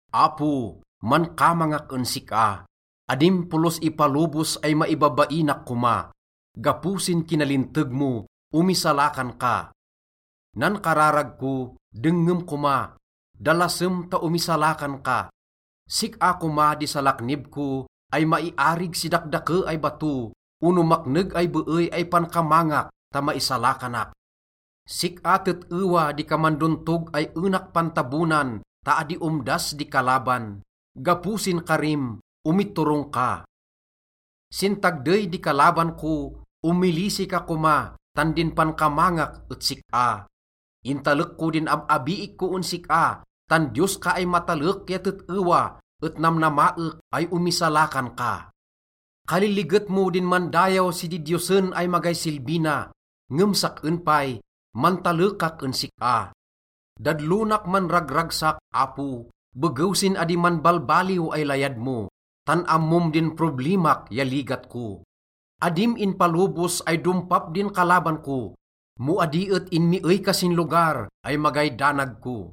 Apo, mankamangak en sik-a, adim polos ipalobos ay maibabainak koma. Gapo sin kinalinteg mo, omisalakan ka. Nan kararag ko, dengngem koma, dalasem ta omisalakan ka. Sik-a koma di salaknib ko ay maiarig si dakdake ay bato ono makneg ay beey ay pankamangak ta maisalakanak. Sik-a tet-ewa di kaman dontog ay enak pantabonan, ta adi omdas di kalaban. Gapo sin karim, omiturong ka. Sin tagdey di kalaban ko, omilisi ka koma, tan din pankamangak et sik-a. Intalek ko din ab-abiik ko en sik-a, tan Diyos ka ay matalek ya tet-ewa, et namnamaek ay omisalakan ka. Kaliliget mo din mandayaw si didiyosen ay magay silbi na, ngem sak-en pay, mantalekak en sik-a. Dadlonak manragragsak, Apo, begew sin adi manbalbaliw ay layad mo, tan ammom din problimak ya ligat ko. Adim inpalobos ay dompap din kalaban ko mo adi et inmiey ka sin lugar ay magay danag ko.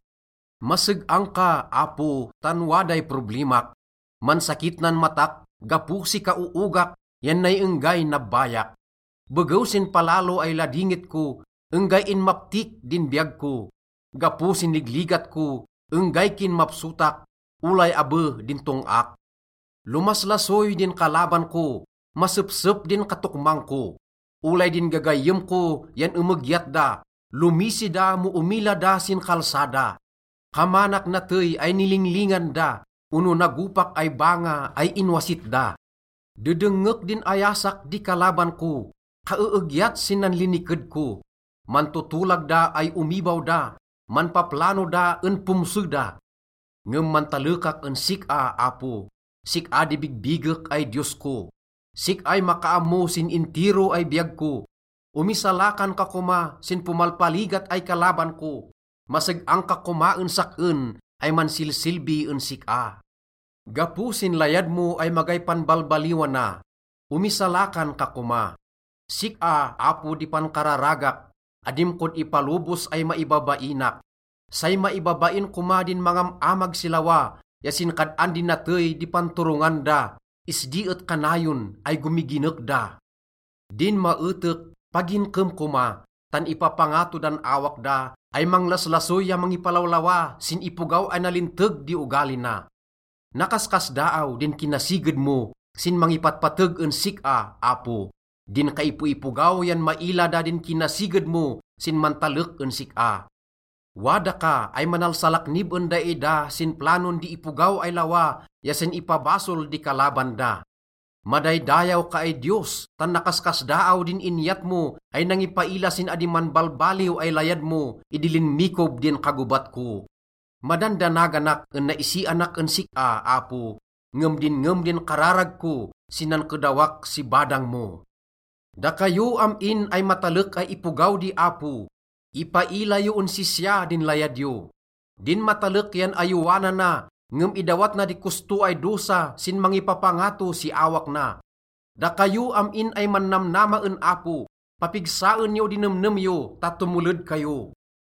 Maseg-ang ka, Apo, tan waday problimak. Mansakit nan matak gapo si kaoogak yan nay enggay nabbayak. Begew sin palalo ay ladingit ko, enggay inmaptik din biyag ko. Gapo sin ligligat ko, enggay kinmapsotak, olay abe din tong-ak. Lomaslasoy din kalaban ko, masepsep din katokmang ko. Olay din gagayyem ko yan emegyat da, lomisi da mo omila da sin kalsada. Kamanak natey ay nilinglingan da ono nagopak ay banga ay inwasit da. Dedengngek din ayasak di kalaban ko, kaeegyat sin nanliniked ko. Mantotolag da ay omibaw da, manpaplano da en pomse da. Ngem mantalekak en sik-a, Apo, sik-a di bigbigek ay Diyos ko. Sik-ay makaammo sin intiro ay biyag ko, omisalakan ka koma sin pomalpaligat ay kalaban ko. Maseg-ang ka koma en sak-en ay mansilsilbi en sik-a. Gapo sin layad mo ay magay panbalbaliwana, omisalakan ka koma. Sik-a, Apo, di pankararagak, adim kod ipalobos ay maibabainak. Say maibabain koma din mangam-amag si lawa ya sin kad-an di natey di panturongan da. Isdi et kanayon ay gomiginek da. Din maetek, paginkem koma, tan ipapangato dan awak da ay manglaslasoy ya mangipalawlawa sin ipogaw ay nalinteg di ogali na. Nakaskasdaaw din kinasiged mo sin mangipatpateg en sik-a, Apo. Din kaipoipogaw yan maila da din kinasiged mo sin mantalek en sik-a. Wada ka ay manalsalaknib en daida sin planon di ipogaw ay lawa ya sin ipabasol di kalaban da. Madaydayaw ka ay Diyos tan nakaskasdaaw din inyat mo ay nangipaila sin adi manbalbaliw ay layad mo idi linmikob din kagobat ko. Madandanaganak en naisianak en sik-a, Apo, ngem dinngem din kararag ko sin nankedawak si badang mo. Dakayo am-in ay matalek ay ipogaw di Apo, ipaila yo en sisya din layad yo. Din matalek yan ayowanana, ngem idawat na di kosto ay dosa sin mangipapangato si awak na. Dakayo am-in ay mannamnama en Apo, papigsaen yo di nemnem yo ta tomoled kayo.